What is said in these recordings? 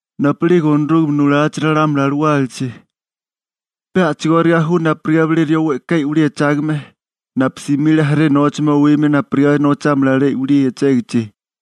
› Napu'lige Onorúgame nulachi ralámuli alawálachi, pe a'chigóriga ju napurigá bilé rió we'ká i'wilí echágame, napu simile jaré nóchame owimia napurigá nochámala alué i'wilí echégichi.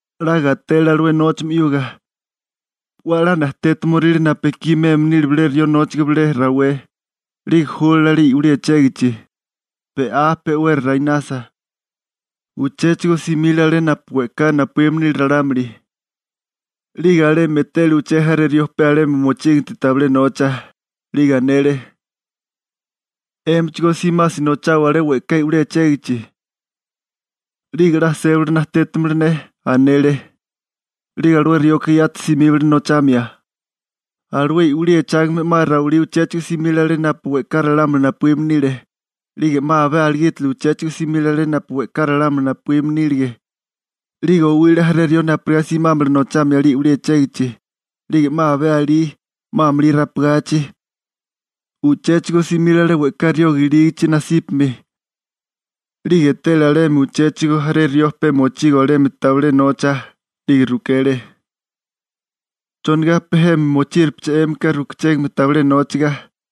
'La gatele alué nóchame 'yuga, 'we a'lá najtétimoríle napu ekí meme nile bilé rió nóchaga bilé rawé, 'lige júlale alé i'wilí echégichi. Be'á, pe'wera rainasa, uchéchigo simile alé napu we'ká napuíme nile ralámuli, 'lige alemi etele uché jaré rió pe alemi mochíginti tabilé nocha. 'Lige anele: «'Émichigó simasi nochawa alé we'ká i'wilí echégichi, 'lige 'la sébali najtétimala ne», anele. 'Lige alué rioka yati simíbale nochamia. Alué i'wilí echágame 'ma rawilí uchéchigo simile alé napu we'ká ralámuli napuíme nile, 'lige 'ma abé aligítili uchéchigo simile alé napu we'ká ralámuli napuíme nílige, 'lige owile jaré rió napurigá simámala nochamia alé i'wilí echégichi. 'Lige 'ma abé alí, 'ma amulí rapagachi, uchéchigo simile alé we'ká rioga ilígichi nasípami, 'lige etele alemi uchéchigo jaré rió pe mochigo alemi tabilé nocha, 'lige rukele: «¿Chonigá pe jemi mochíripeché 'émika rukuchégame tabilé nóchaga?»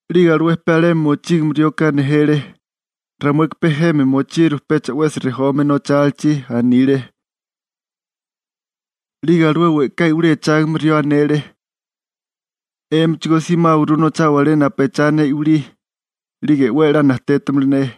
'Lige alué pe alemi mochígame rioka nejele: «Ramueka pe jemi mochiru pecha 'wesi rejome nochálichi», anile. 'Lige alué we'ká i'wilí echágame rió anele: «'Émichigó simáwaguru nochawa alé napu echá ne i'wilí, 'lige 'we a'lá najtétimala ne.» ›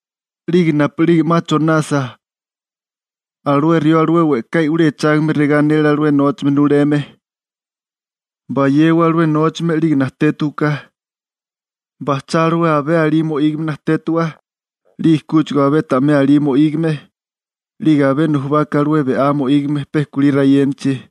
'Lige napu'lige 'ma chonasa, alué rió alué we'ká i'wilí echágame regá anele alué nóchame nuleme: «Bayewa alué nóchame 'lige najtétiwaká, bajchá alué abé alí mo'ígame najtétiwa, 'lige kúchigo abé ta'mé alí mo'ígame, 'lige abé nujubaka alué be'á mo'ígame pe kulí rayénachi.»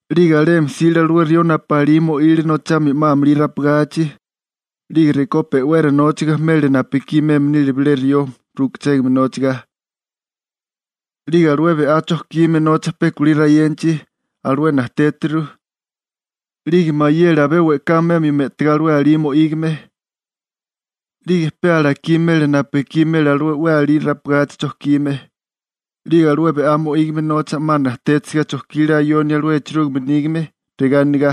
'Lige alemi jsile alué rió napu 'ma alí mo'ile nochamia 'ma amulí rapagachi, 'lige rekó pe'wera nóchaga mele napu ekí meme nile bilé rió rukuchégame nóchaga. 'Lige alué be'á chojkime nocha pe kulí rayénachi, alué najtétiru, 'lige mayele abé we'ká memio me'tigá alué alí mo'ígame, 'lige pe alakí mele napu ekí mele alué 'we alí rapagachi chojkime. 'Lige alué be'á mo'ígame nocha 'ma najtétisiga chojkile ayonia alué echerúgime nígame, regá anigá: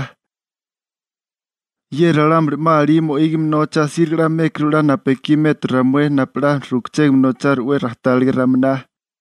«Ye ralámuli 'ma alí mo'ígame nocha asíriga 'la mékuru 'la napu ekí metu ramué napu 'la rukachégame nocharu 'we rajtáliga raminá.»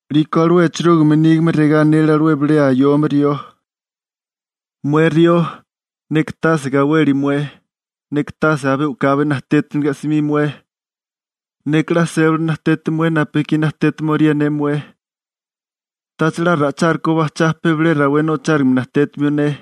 'Liko alué echerúgime nígame regá anele alué bilé ayome rió: «Mué rió, neka tase gaweli mué, neka tase abé u'kabi najtétiniliga 'smi mué, neka 'la sébali najteti mué napu ekí najtétimiorié ne mué, ¿tacha 'la ra'ichárukó bajchá pe bilé rawé nochárigime najtétimio ne?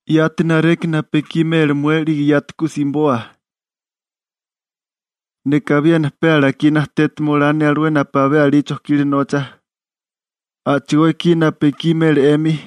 Yati nareki napu ekí mele mué 'lige yati ku simiboa. Neka abiena pe alakí najtétima olá ne alué napu abé alí chojkile nocha, a'chigó ekí napu ekí mele 'emi.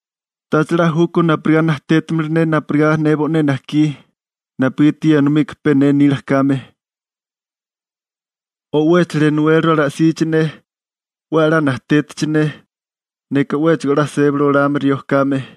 ¿Tacha 'la júkó napurigá najtétimala ne napurigá ne bo'né najkí?, napugiti ye enomika pe ne nila kame. O ¿'wéchala enowéliru ala'sichi ne, 'we a'lá najtétichi ne, neka 'wéchigo a'lá sébali olame rió kame?»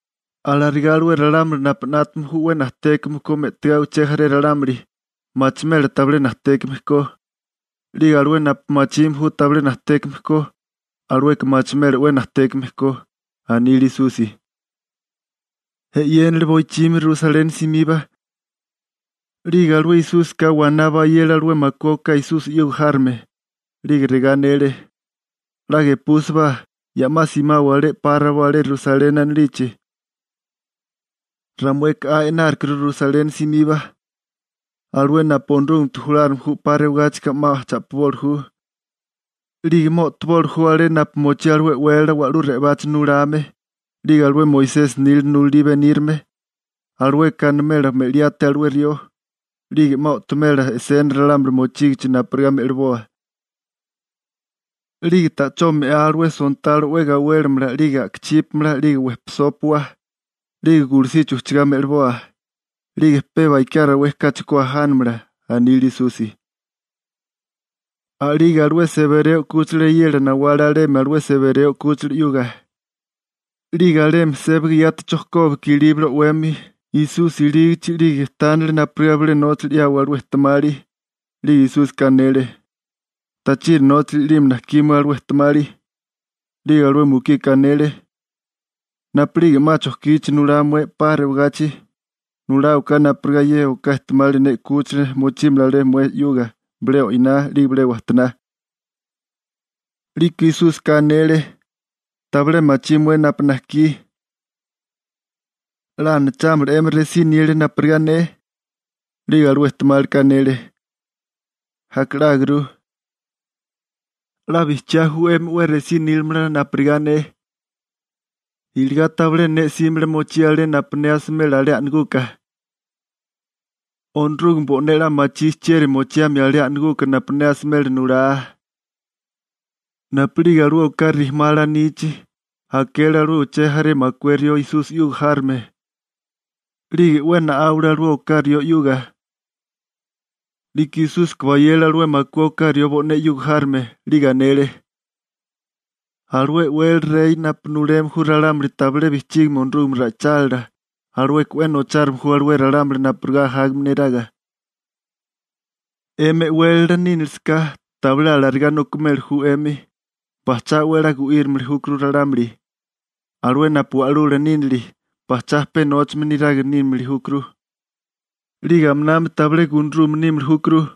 Alarigá alué ralámuli napu 'nátame ju 'we najtékame ko me'tigá uché jaré ralámuli, machimela tabilé najtékame ko, 'lige alué napu 'la machime ju tabilé najtékame ko, alueka machimela 'we najtékame ko ―anile Esusi. Boichimi 'yéniga Rusaleni simiba, 'lige alué Esúsika waná bayele alué makué oká Esusi 'yuga járome, 'lige regá anele: ―'La gepúsibá, ya 'ma simawa alé 'pa rabó alé Rusaleni anilichi. Ramueka 'a e'nárukuru Rusaleni simiba. Alué napu Onorúgamete julárigame ju 'pa rewagáchika 'ma cha'piboli ju, 'lige 'ma o'toboli ju alé napu mochí alué e'wélala wa'lú re'obachi nulame 'lige alué Moisesi nila nulalí benírame. Alueka animela me'liáté alué rió, 'lige 'ma o'tomela e'sena ralámuli mochígichi napurigá me'liboa. 'Lige ta'chó me'á, alué sontalo 'we gawélimala 'lige a'kachípamala 'lige wejpisópua, 'lige gulusichi ujchagá me'liboa, 'lige pe bakiá rawé kachi ku ajánamala ―anile Esusi. A'lige alué Sebereo 'kúchila eyela nawale alemi alué Sebereo 'kúchila 'yuga, 'lige alemi sébaga yati chojkóbaka ilíbale o'wemi Esusi ilígichi 'lige tánale napurigá bilé nóchali 'yawa alué ejtemali. 'Lige Esúsika anele: ―¿Tachiri nóchali i'lime najkí mué alué ejtemali? 'Lige alué mukika anele: ―Napu'lige 'ma chojkichi nulá mué 'pa rewagachi, nuláwaká napurigá ye oká ejtemali ne 'kúchila mochímala alé mué 'yuga, bilé o'iná 'lige bilé wajtoná. 'Liko Esúsika anele: ―Tabilé machí mué napu najkí. ¿'La anachámala 'emi resí nilia napurigá ne? 'Lige alué ejtemálika anele: ―Aka 'lágurú. ―'La bijchiá ju 'emi 'we resí nílamala napurigá ne ―anele Esusi― iligá tabilé ne 'símala mochía alé napu ne asimela alé a'naguka. Onorúgame bo'né 'la machí chieri mochiamia alé a'naguka napu ne asimela nulá. Napu'lige alué oká rijimá alanichi, akele alué uché jaré makué rió Esusi 'yuga járome, 'lige 'we na'áwale alué oká rió 'yuga. 'Liko Esúsika bayele alué makué oká rió bo'né 'yuga járome, 'lige anele: ―Alué e'wélala rey napu nuleme ju ralámuli tabilé bijchígame Onorúgame ra'ichálila, alueka 'we nochárime ju alué ralámuli napurigá ajágame neraga. 'Emi e'wélala nínilisaká, tabilé alarigá nokimeli ju 'emi, bajchá 'we a'lá gu'írimili júkuru ralámuli. Alué napu wa'lula nínili, bajchá pe nóchame niraga nímili júkuru, 'lige aminami tabilé gunarume nímili júkuru.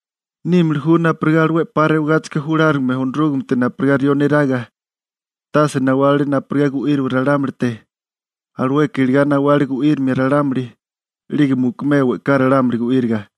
Nímili ju napurigá alué 'pa rewagáchika julárigame Onorúgamete napurigá rió neraga. Tase nawale napurigá gu'íriwa ralámulite, alueka iligá nawale gu'írimia ralámuli, 'lige mukumea we'ká ralámuli gu'íriga.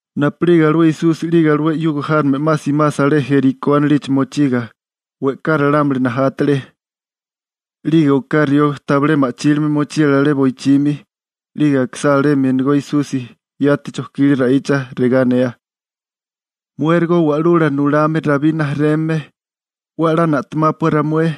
Napu'lige alué Esusi 'lige alué 'yuga járome 'ma simasa alé Jerikó anilichi mochiga, we'ká ralámuli najátale. 'Lige oká rió tabilé ma'chílime mochile alé boichimi, 'lige akisá alemi enegó Esusi, yati chojkile ra'icha, regá anea: ―¡Muérigo Wa'lula Nulame Rabí rijimala, 'we a'lá na'temápua ramué!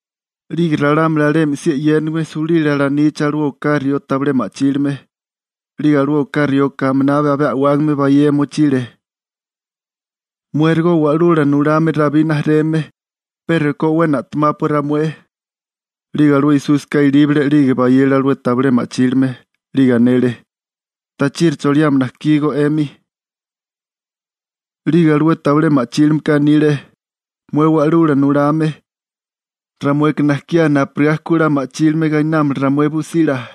'Lige ralámuli alemi si e'yénigime sulile alanichi alué oká rió tabilé ma'chílime, 'lige alué oká rioka aminabi abé a'wágame bayea mochile: ―¡Muérigo Wa'lula Nulame Rabí rijimala, pe rekó 'we na'temápua ramué! 'Lige alué Esúsika ilíbale 'lige bayele alué tabilé ma'chílime, 'lige anele: ―¿Tachiri choliame najkígó 'emi? 'Lige alué tabilé ma'chílimeka anile: ―Mué Wa'lula Nulame, ramueka najkiá napurigá ku 'la ma'chílime gainámala ramué busila.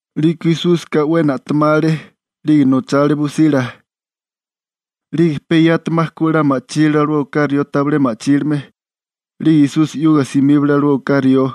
'Liko Esúsika 'we na'temale, 'lige nochale busila, 'lige pe yati 'ma ku 'la ma'chílile alué oká rió tabilé ma'chílime, 'lige Esusi 'yuga simíbale alué oká rió.